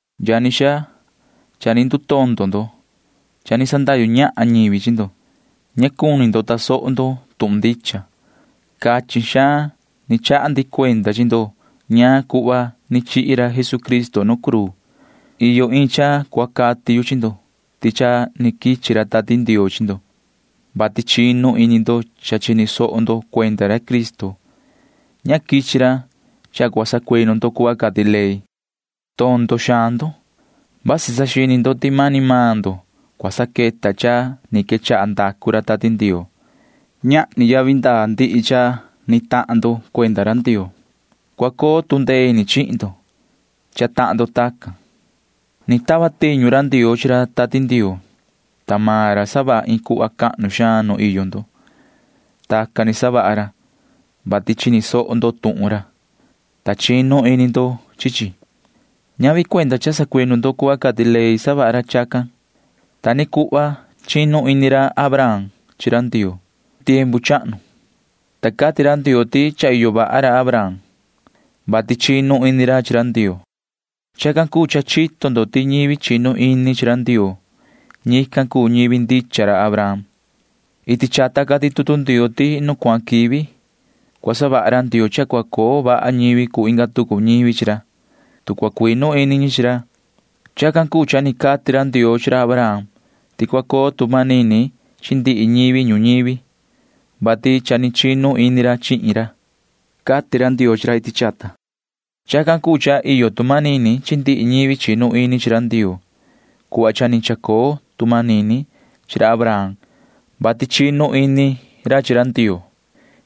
Yani xaa, cha ni ndutondo ndo. Cha ni sandahyu ñahan ñivi chi ndo, [ta ña ni tasoho ndo tuhun ndicha]. Cachin xaan chaha ndi cuenda chi ndo ñaan cuhva ni chihi ra Jesucristo nu cruu. Iyo iin cha cua cati yu chi ndo ti cha ni quichi ra Tati Ndioo chi ndo, vati chinu ini ndo cha chini soho ndo cuenda ra Cristo. Ñavi cha ni quichi ra, vati cua sacuinu ndo cuhva cati ley. Tondo xaan ndo. Vasi saxini ndo ti cha mani maan ndo cua saqueta cha ni quechaha savaha ra Tati Ndioo. Masi ñahni yavi ndaa ndihi cha ni tahan ndo [cuenda ra Ndioo]. Masi cua coo tu ndee ini chihin ndo cha tahan ndo tacan. Ni tava tiñu ra Ndioo chi ra Tati Ndioo, ta maan ra savaha iin cuhva cahnu xaan nu iyo ndo. Tacan ni savaha ra, vati chini soho ndo tuhun ra, ta chinu ini ndo chi chi. Ñavi cuenda cha sacuinu ndo cuhva cati ley savaha ra chacan. Ta ni cuhva chinu ini ra Abraham chi ra Ndioo iti chata tiempu chahnu, ta cati ra Ndioo ti cha iyo vaha ra Abraham, vati chinu ini ra chi ra Ndioo. Chacan cuu cha chito ndo ti ñivi chinu ini chi ra Ndioo―ñican cuu ñivi ndicha ra Abraham. Iti chata cati tutu Ndioo ti nu cuahan quivi cua savaha ra Ndioo cha cua coo vaha ñivi cuu inga tucu ñivi chi ra, tu cua cuinu ini ñi chi ra. Chacan cuu cha cati ra Ndioo chi ra Abraham ti cua coo tu manini chi ndihi ñivi ñuñivi, vati cha chinu ini maan ra chihin ra, cati ra Ndioo chi ra iti chata. Chacan cuu cha iyo tu manini chi ndihi ñivi chinu ini chi ra Ndioo cuhva cha ni chacoo tu manini chi ra Abraham, vati chinu ini ra chi Ndioo.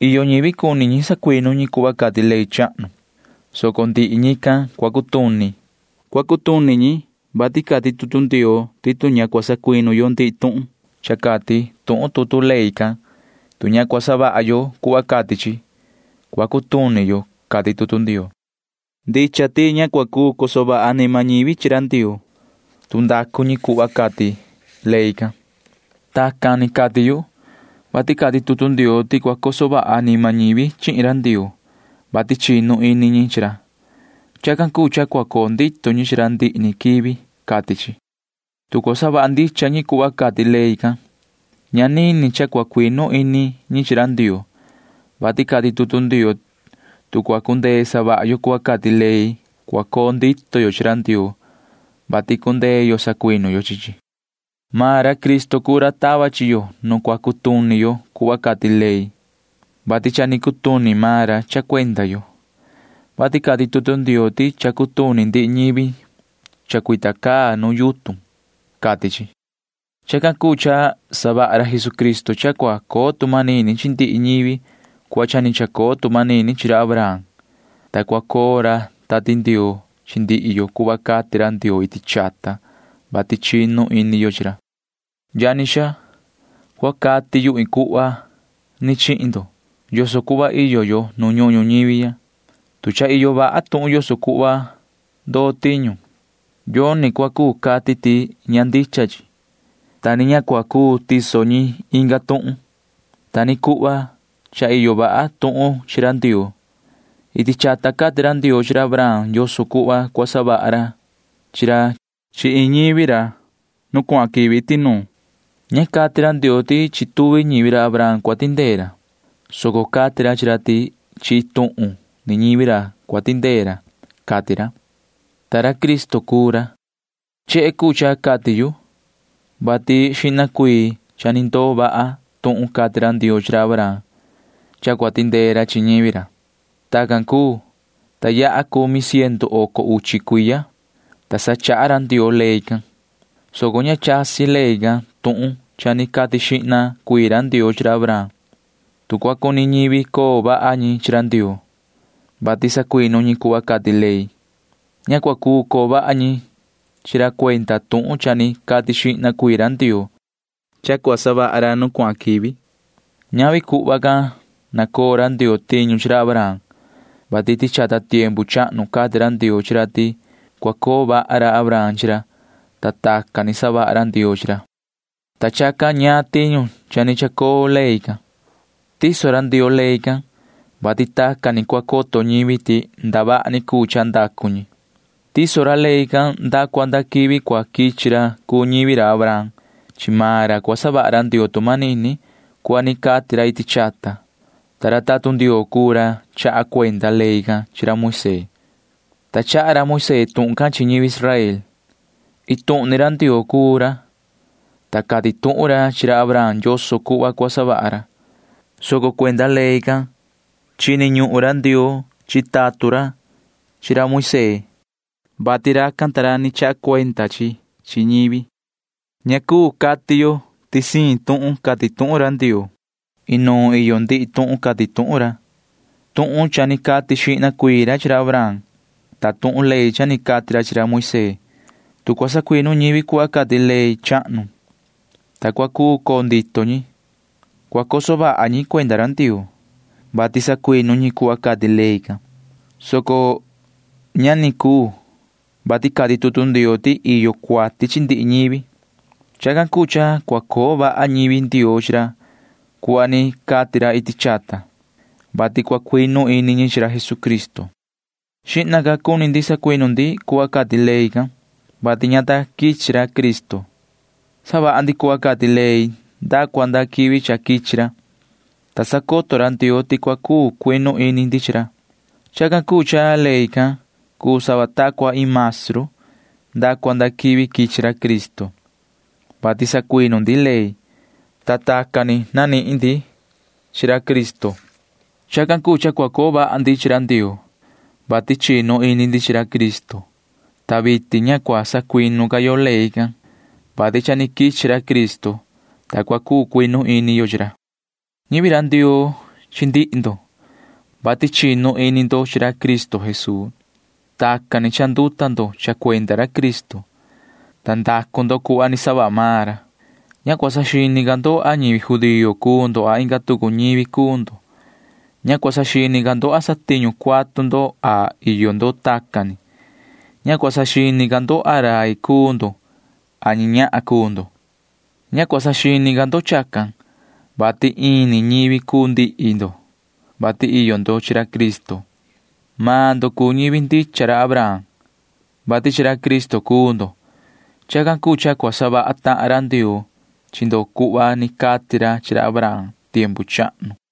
Iyo ñivi cuni ñi sacuinu ñi cuhva cati ley chahnu, soco ndihi ñican cua cutuni. Cua cutuni ñi, vati cati tutu Ndioo ti tu ña cua sacuinu yo ndihi tuhun cha cati tuhun tutu ley can, tu ña cua savaha yo cuhva cati chi, cua cutuni yo, cati tutu Ndioo can. Ndicha ti ña cua cuu coso vaha anima ñivi chi ra Ndioo, ta ndacu ñi cuhva cati ley can. Tacan ni cati yu, vati cati tutu Ndioo ti cua coso vaha anima ñivi chihin ra Ndioo, vati chinu ini ñi chi ra. Chacan cuu cha cua coo ndito ñi chi ra ndihi ni quivi, cati chi. Tu cua savaha ndicha ñi cuhva cati ley can, ña nini cha cua cuinu ini ñi chi ra Ndioo, vati cati tutu Ndioo tu cua cundee savaha yo cuhva cati ley, cua coo ndito yo chi ra Ndioo, vati cundee yo sacuinu yo chi chi. Maan ra Cristo cuu ra tava chi yo nu cua cutuni yo cuhva cati ley, vati cha ni cutuni maan ra cha cuenda yo, vati cati tutu Ndioo ti cha cutuni ndihi ñivi chacuita caa nu yutun, cati chi. Chacan cuu cha savaha ra Jesucristo cha cua coo tu manini chi ndihi ñivi cuhva cha ni chacoo tu manini chi ra Abraham, ta cua coo ra Tati Ndioo chi ndihi yo cuhva cati ra Ndioo iti chata, vati chinu ini yo chi ra. Yani xaa, cua cati yu iin cuhva chihin ndo yoso cuhva iyo yo nu ñuhun ñuñivi ya. Tu cha iyo vaha tuhun yoso cuhva cua ndoo tiñu, yoni cua cuu cati ti ña ndicha chi, ta ni ña cua cuu tiso ñi inga tuhun. [Ta ni cuhva cha iyo vaha tuhun chi ra Ndioo.] Iti chata cati ra Ndioo chi ra Abraham yoso cuhva cua savaha ra chi ra chi iin ñivi ra nu cuahan quivi iti nuun. Ña cati ra Ndioo ti chi tuvi ñivi ra Abraham cua tindee ra, soco cati ra chi ra ti chi iin tuhun ni ñivi ra cua tindee ra, cati ra, ta ra Cristo cuu ra. Chehe cuu cha cati yu, vati xihna ca cha ni ndoo vaha tuhun cati ra Ndioo chi ra Abraham [cha cua tindee ra chi ñivi ra]. Tacan cuu, ta yaha cumi ciendu oco uchi cuiya, ta sa chaha ra Ndioo ley can, soco ña chasi ley can tuhun cha ni cati xihna ra Ndioo chi ra Abraham. Tu cua cuni coo vaha ñivi chi ra Ndioo, vati sacuinu ñi cuhva cati ley, ña cua cuu coo vaha ñi chi ra cuenda tuhun cha ni cati xihna ra Ndioo cha cua savaha ra nu cuahan quivi. Ñavi tacan ni savaha ra Ndioo chi ra Abraham, vati iti chata tiempu chahnu cati ra Ndioo chi ra ti cua coo vaha ra Abraham chi ra, ta tacan ni cha ni savaha ra Ndioo chi ra. Yuhu cati ñaan tiñu cha ni chacoo ley can. Tiso ra Ndioo ley can, vati tacan ni cua coto ñivi ti ndavaha ni cuu cha ndacu ñi. Tiso ra ley can nda cua nda quivi cua quichi ra cuu ñivi ra Abraham. Chi maan ra cua savaha ra Ndioo tu manini cuhva ni cati ra iti chata. Ta ra tatun Ndioo cuu ra chaha cuenda ley can chi ra Moisee, [ta chaha ra Moisee tuhun can chi ñivi Israel]. Iin tuhun ni ra Ndioo cuu ra, ta cati tuhun ra chi ra Abraham yoso cuhva cua savaha ra, soco cha cuenda ley can chini ñuhun ra Ndioo chi tatun ra chi ra Moisee, vati racan ta ra chaha cuenda ra chi chi chi ñivi. Ña cuu cati yo ti siin siin tuhun cati tuhun ra Ndioo. Inuun iyo ndihi tuhun cati tuhun ra―vasi tuhun ni cati xihna ra chi ra Abraham, vasi tuhun ley cha ni cati ra chi ra Moisee. Tu cua sacuinu ñivi cuhva cati ley chahnu, ta cua cuu coo ndito ñi, cua coso vaha ñi cuenda ra Ndioo, vati sacuinu ñi cuhva cati ley can, soco ña ni cuu, vati cati tutu Ndioo ti iyo cuati chi ndihi ñivi. Chacan cuu cha cua coo vaha ñivi Ndioo chi ra cuhva ni cati ra iti chata, vati cua cuinu ini ñi chi ra Jesucristo. Xihna ca cuni ndi sacuinu ndi cuhva cati ley can, vati ña ta quichi ra Cristo. Savaha ndi cuhva cati ley nda cua nda quivi cua quichi ra, ta cua sacoto ra Ndioo ti cua cuu cuinu ini ndi chi ra. Chacan cuu cha ley can cuu sava ta cua iin maestru nda cua nda quivi quichi ra Cristo, vati sacuinu ndi ley, [ta tacan ni nanihin ndi chi ra Cristo]. Chacan cuu cha cua coo vaha ndi chi ra Ndioo, vati chinu ini ndi chi ra Cristo. Ta vitin ña cua sacuinu ca yo ley can, vati cha ni quichi ra Cristo, ta cha cuu cuinu ini yo chi ra. Ñivi ra Ndioo chi ndihi ndo, vati chinu ini ndo chi ra Cristo Jesuu. Tacan ni cha ni chanduta ndo cha cuenda ra Cristo, ta ndacu ndo cuhva ni savaha maan ra. Ña cua saxini ca ndo a ñivi judío cuu ndo a inga tucu ñivi cuu ndo. Ña cua saxini ca ndo a satiñu cuatu ndo a iyo ndo tacan ni. Ña cua saxini ca ndo a ra rai cuu ndo a ñi ñahan cuu ndo. Ña cua saxini ca ndo chacan, vati ini ñivi cuu ndihi ndo, vati iyo ndo chi ra Cristo. Maan ndo cuu ñivi ndicha ra Abraham, vati chi ra Cristo cuu ndo. Chacan cuu cha cua savaha tahan ra Ndioo chi ndo cuhva ni cati ra chi ra Abraham tiempu chahnu.